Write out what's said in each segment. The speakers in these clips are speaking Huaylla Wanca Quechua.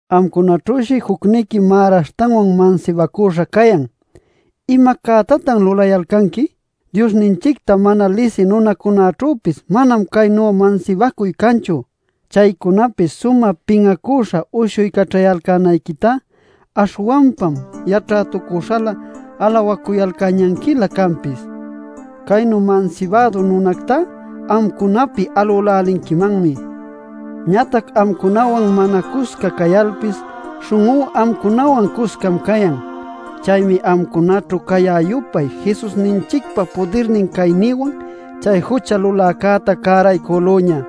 Amcunaćhüshi jucniqui märaśhtanwan mansibacüśha cayan. ¡¿Ima cätatan lulayalcanqui?! ¡Diosninchicta mana lisï nunacunaćhüpis manam caynu mansibacuy canchu! Chaycunapi sumä pin'acüśha uyshuycaćhayalcänayquitá, ¡aśhwanpam yaćhätucuśhalä alawacuyalcäñanquiña canpis! Caynu mansibädu nunactá amcunapi alülälinquimanmi. Ñatac amcunawan mana cusca cayalpis, śhun'ú amcunawan cuscam cayan. Chaymi amcunaćhu cayä-yupay Jesusninchicpa pudirnin caynïwan chay jucha luläcäta cäraycülüña.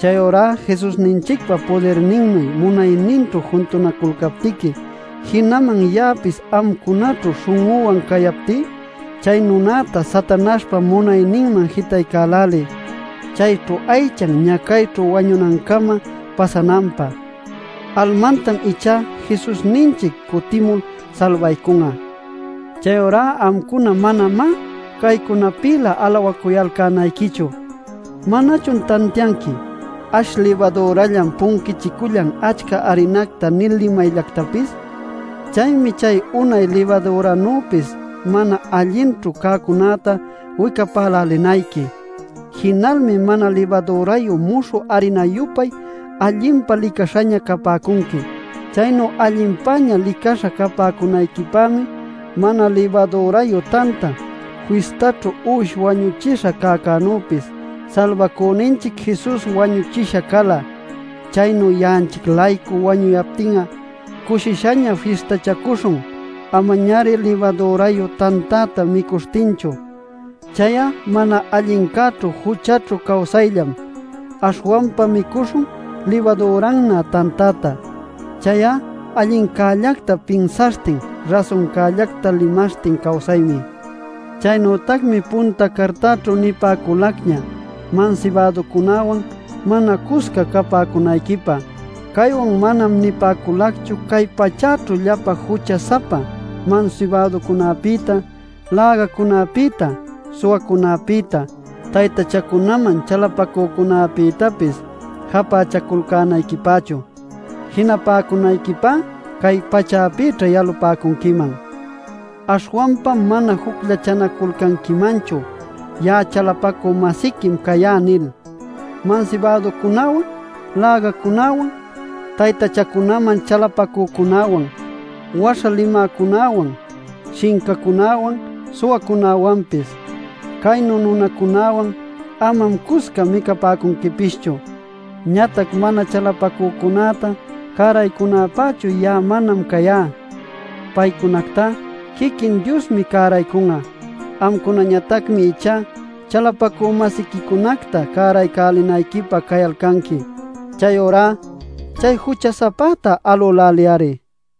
Chayurá Jesusninchicpa pudirninnuy munayninćhu juntunaculcaptiqui, jinaman ya'apis amcunaćhu śhun'üwan cayaptí, chay nunacta Satanaśhpa munayninman jitaycäläliy, chayćhu aychan ñacayćhu wañunancama pasananpä. Almantam ichá Jesusninchic cutimul salbaycun'a. Chayurá amcuna manamá caycunapïlä alawacuyalcänayquichu. ¿Manachun tantianqui: “Ash libadürallam punquichicüllan achca arinacta” nil limayllactapis? Chaymi chay unay libadüranuypis mana allinćhu cäcunäta wicapälälinayqui. Jinalmi mana libadürayu muśhü arina-yupay allinpa licaśhaña capäcunqui. Chaynu allinpäña licaśha capäcunayquipämi Mana Libadürayu Tanta Fistaćhu uwish wañuchisha cäcänüpis Salbacüninchic Jesus wañuchisha cala. Chaynu ya'anchic-laycu wañuyaptin'a, cushishaña fistachacuśhun. Amañari libadürayu tantäta micuśhtinchu; chay'a mana allincäćhu juchaćhu cawsayllam. Aśhwanpa micuśhun libadürannä tantäta; chay'a allincällacta pinsaśhtin rasuncäta limaśhtin cawsaymi. Chaynütacmi punta cartaćhu nipäculacña mansibäducunäwan mana cusca capäcunayquipä. Caywan manam nipäculacchu cay pachäćhu llapa jucha-sapa mansibäducunapïta, lägacunapïta, suwacunapïta, taytachacunaman chalapacücunapïtapis japächaculcänayquipächu. Jinapäcunayquipá cay pachäpïćha yalapäcunquiman. Aśhwanpam mana jucllachanaculcanquimanchu: “Ya'a chalapacü-masiquim cayá” nil mansibäducunäwan, lägacunäwan, taytachacunaman chalapacücunäwan, waśha limäcunäwan, shincacunäwan, suwacunäwanpis. Caynu nunacunäwan amam cusca micapäcunquipischu. Ñatac mana chalapacücunäta cäraycunäpächu ya'a manam cayá. Paycunactá quiquin Diosmi cäraycun'a. Amcunañatacmi ichá chalapacü-masiquicunacta cäraycälinayquipä cayalcanqui. Chayurá “chay jucha-sapäta alüläliy-ari”.